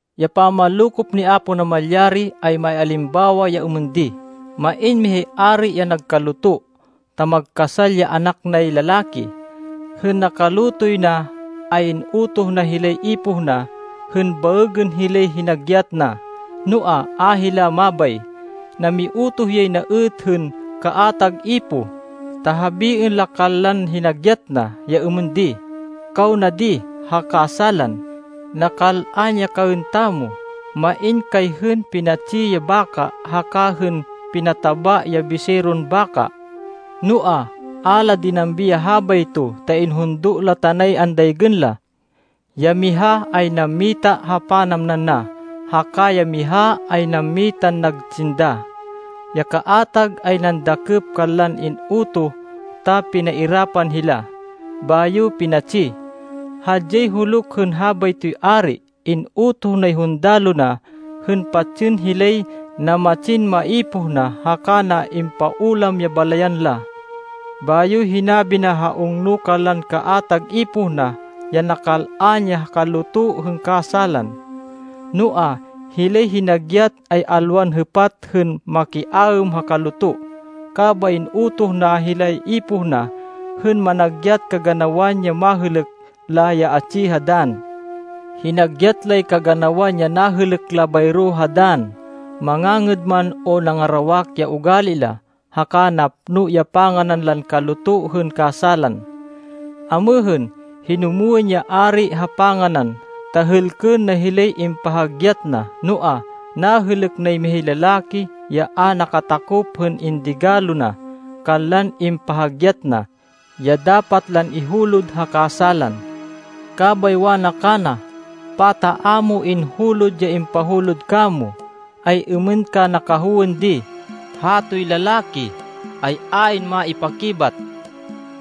“Ya pamanlokop ni Apo Namalyari ay maialimbawa ya êmên di: Main mihay ari ya nagkaluto, ta magkasal ya anak nay lalaki. Hên nakalutoy na, ay in-utoh na hilay ipoh na hên baêgên hilay hinagyat na, noa, a hila mabay. Namiutoh yay na êt hên kaatag ipoh, ta habiên la kanlan hinagyat na, ya êmên di, ‘Kaw na di ha kasálan, nakal-an ya kaên tamo. Main kay hên pinatsi ya baka haka hên pinataba ya biseron baka.’ Noa, a la dinambi ya habayto ta inhundo la tanay andaygên la. Ya miha ay nammita ha panamnan na, haka ya miha ay nammitan nagtsinda. Ya kaatag ay nandakêp kanlan in-utoh ta pinairapan hila, bayo pinatsi. Hadyay huluk hên habaytoy ari. In-utoh nay hundaloh na hên patsên hilay namatsin maipoh na, haka na impaulam ya balayan la. Bayo hinabi na ha ungno kanlan kaatag ipoh na, ya nakal-an ya kaluto hên kasálan, noa, hilay hinagyat, ay alwan hêpat hên makiaêm ha kaluto. Kabay in-utoh na hilay ipoh na hên managyat kaganawan ya mahêlêk la ya atsi ha dann. Hinagyat lay kaganawan ya nahêlêk la bayro ha dann, mangangêd man o nangarawak ya ugali la, haka napno ya panganan lan kaluto hên kasálan. “Amêhên, hinumwên ya ari ha panganan ta hêlkên na hilay impahagyat na. Noa, nahêlêk nay mihay lalaki ya a nakatakop hên indigalo na kanlan impahagyat na, ya dapat lan ihulod ha kasálan. Kabay wana kana, ‘Pata a mo inhulod ya impahulod kamo! Ay-êmên ka nakahowên di!’ Hatoy lalaki, ay ayn maipakibat.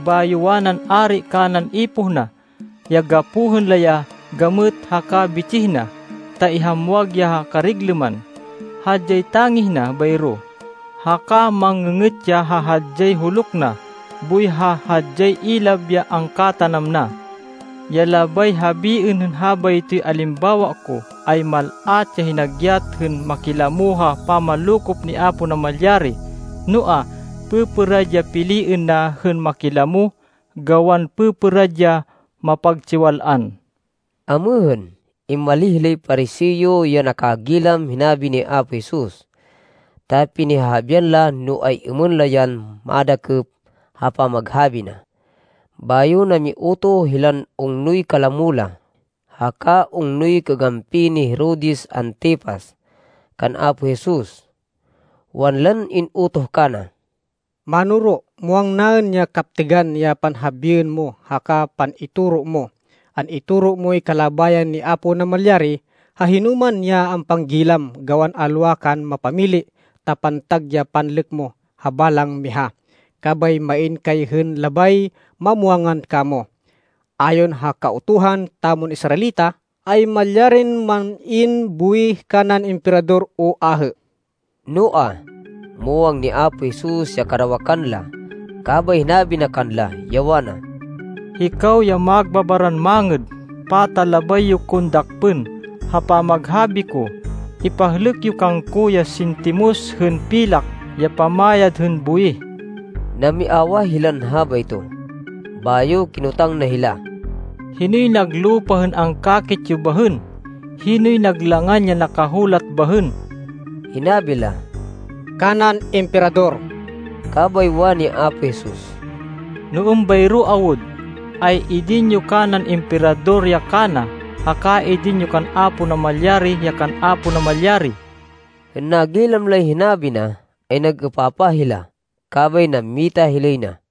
Bayo wanan ari kanlan ipoh na, ya gapohên la ya gamêt haka bitsih na, ta ihamwag ya ha kariglêman. Hadyay tangih na bayro, haka mang-ngê-ngêt ya ha hadyay huluk na boy ha hadyay ilab ya angkatanam na. Ya labay habiên hên habaytoy alimbawa ko, ay mal-at ya hinagyat hên makilamo ha pamanlokop ni Apo Namalyari, noa, pêpêrad ya piliên na hên makilamo, gawan pêpêrad ya mapagtsiwal-an.” Amêhên, immalíh hilay Pariseo ya nakagilam hinabi ni Apo Jesus, ta pinihahabian la no ay-êmên la yan madakêp ha pamaghabi na. Bayo namiutoh hilan ungnoy kalamo la, haka ungnoy kagampi ni Herodes Antipas kan Apo Jesus. Wanlan in-utoh kana, “Mánoro, muwang naên ya kaptêgan ya panhabiên mo haka pan-itoro mo. An-itoro moy kalabayan ni Apo Namalyari, ha hinoman ya ampanggilam gawan alwa kan mapamili, ta pantag ya panlêk mo ha balang miha. Kabay main kay hên labay mamwangan kamo. Ayon ha Kautuhan tamon Israelita, ay malyarin mam-in buwih kanan Emperador o ahê?” Noa, muwang ni Apo Jesus ya karawakan la, kabay hinabi na kanla, ya wana, “Hikaw ya magbabaran mangêd, pata labay yo kon dakpên ha pamaghabi ko! Ipahlêk yo kangko ya sintimos hên pilak ya pamayad hên buwih.” Namiawah hilan habayto, bayo kinotang na hila, “Hinoy nag lupa hên angkakit yo bahên? Hinoy nag langan ya nakahulat bahên?” Hinabi la, “Kanan Emperador.” Kabay wani Apo Jesus, “No êmbayro awud, ay idin yo kanan Emperador ya kana, haka idin yo kan Apo Namalyari ya kan Apo Namalyari.” Hên nagilam lay hinabi na, ay nag-êpapah hila. Kabay nammita hilay na.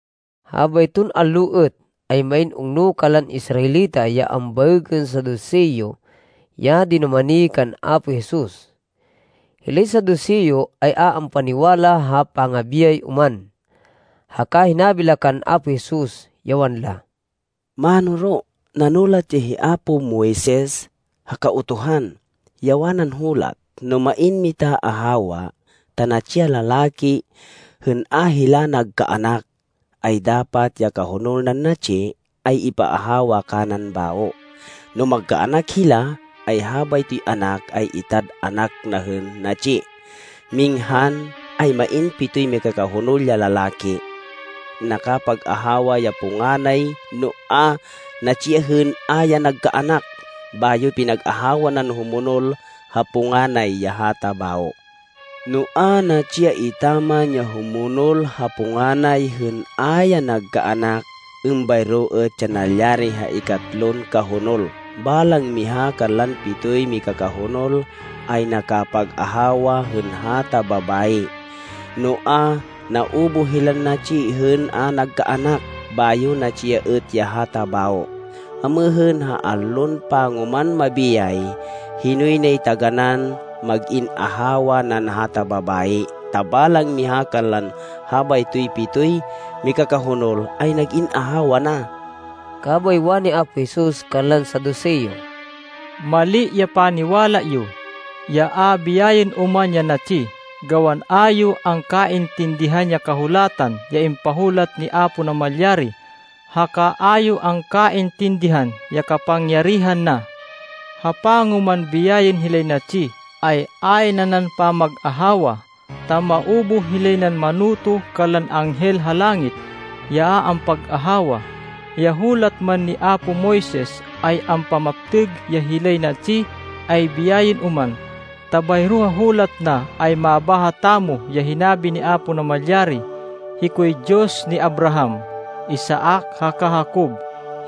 Habayton allo êt, ay main ungno kanlan Israelita ya ambaêgên Saduseo ya dinumani kan Apo Jesus. Hilay Saduseo ay a ampaniwala ha pangabiyay oman. Haka hinabi la kan Apo Jesus, ya wanla, “Mánoro, nanulat ya hi apo Moises ha Kautuhan, ya wanan hulat, ‘No main mitaahawa, ta natsi ya lalaki hên a hila nagkaanak, ay dapat ya kahonol nan natsi, ay ipaahawa kanan bawo. No magkaanak hila, ay habaytoy anak, ay itad anak na hên natsi.’ Minghan, ay main pitoy mikakahonol ya lalaki. Nakapag-ahawa ya punganay, noa, natsi ya hên a ya nagkaanak. Bayo pinag-ahawa nan humonol ha punganay ya hata bawo. Noa, natsi ya etaman ya humonol ha punganay hên a ya nagkaanak. Êmbayro êt ya nalyari ha ikatlon kahonol. Balang miha kanlan pitoy mikakahonol ay nakapag-ahawa hên hata babayi, noa, naubuh hilan natsi hên a nagkaanak. Bayo natsi ya êt ya hata bawo. Amêhên, ha allon pangoman mabiyay, hinoy nay taganán mag-in ahawa nan hata babayi, ta balang miha kanlan habaytoy pitoy mikakahonol ay nag-in ahawa na?” Kabay wani Apo Jesus kanlan Saduseo, “Mali ya paniwala yo, ya a biyayên oman ya natsi, gawan a yo angkaintindihan ya Kahulatan ya impahulat ni Apo Namalyari haka a yo angkaintindihan ya kapangyarihan na! Ha pangoman biyayên hilay natsi, ay ayn nanan pamag-ahawa, ta maubuh hilay nan manoto kanlan anghel ha langit ya a ampag-ahawa. Ya hulat man ni apo Moises ay ampamaptêg ya hilay natsi ay biyayên oman, ta bayro ha hulat na ay mabáha tamo ya hinabi ni Apo Namalyari, ‘Hikoy Diyos ni Abraham, Isaac, haka Jacob.’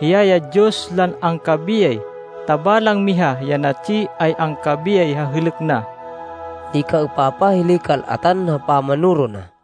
Hiya ya Diyos lan angkabiyay, ta balang miha ya natsi, ay angkabiyay ha hêlêk na.” Nikaêpapah hilay kal-atan ha pamanoro na.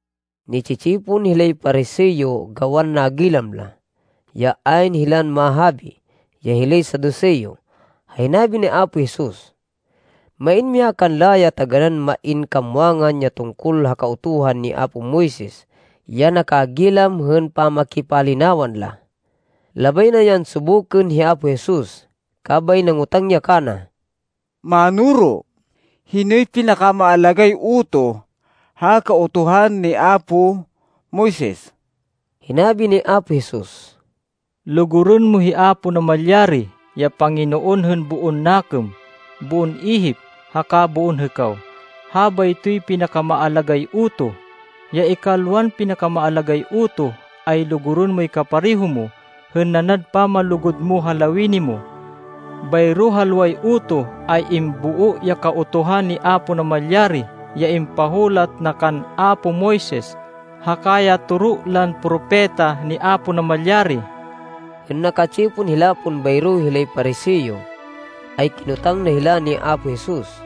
Ni-tsi-tsipon hilay Pariseo gawan nagilam la, ya ayn hilan mahabi, ya hilay Saduseo, ha hinabi ni Apo Jesus. Main miha kanla ya taganán main kamwangan ya tungkol ha Kautuhan ni apo Moises ya nakagilam hên pamakipalinawan la. Labay na yan subukên hi Apo Jesus, kabay nangotang ya kana, “Mánoro, hinoy pinakamaalagáy utoh ha Kautuhan ni apo Moises?” Hinabi ni Apo Jesus, “‘Lugurên mo hi Apo Namalyari, ya Panginoon hên boon nakêm, boon ihip, haka boon hêkaw.’ Habaytoy pinakamaalagáy utoh. Ya ikalwan pinakamaalagáy utoh ay ‘Lugurên moy kapareho mo hên nanad pamanlugud mo ha lawini mo.’ Bayro ha loway utoh, ay imboo ya Kautuhan ni Apo Namalyari ya impahulat na kan apo Moises, haka ya toro lan propeta ni Apo Namalyari.” Hên naka-tsipon hila pon bayro hilay Pariseo, ay kinotang na hila ni Apo Jesus,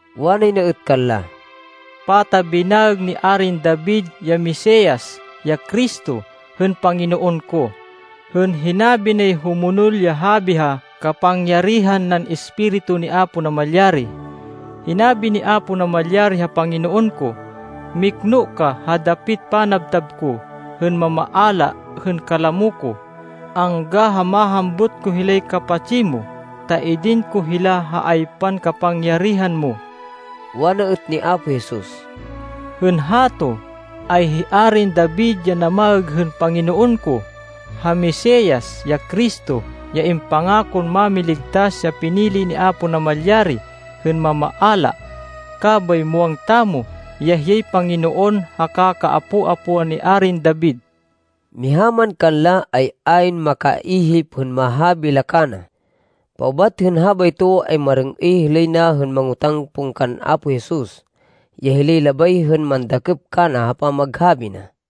Wanay na êt kanla, “Pata binaêg ni Arin David ya Mesias, ya Cristo, hên ‘Panginoon ko’ hên hinabi nay humonol ya habi ha kapangyarihan nan Espiritu ni Apo Namalyari? ‘Hinabi ni Apo Namalyari ha Panginoon ko, “Mikno ka ha dapit panabtab ko hên mamaala hên kalamo ko, angga ha mahambut ko hilay kapatsi mo, ta idin ko hila ha aypan kapangyarihan mo.”’” Wana êt ni Apo Jesus, “Hên hato, ay hi Arin David ya namaêg hên ‘Panginoon ko’ ha Mesias, ya Cristo, ya impangakon Mámiligtas ya pinili ni Apo Namalyari hên mamaala. Kabay muwang tamo, ya hiyay Panginoon haka kaapo-apoan ni Arin David.” Miha man kanla, ay ayn makaihip hên mahabi la kana. Paubat hên habayto ay marêng-êy hilay na hên mangotáng pon kan Apo Jesus ya hilay labay hên mandakêp kana ha pamaghabi na.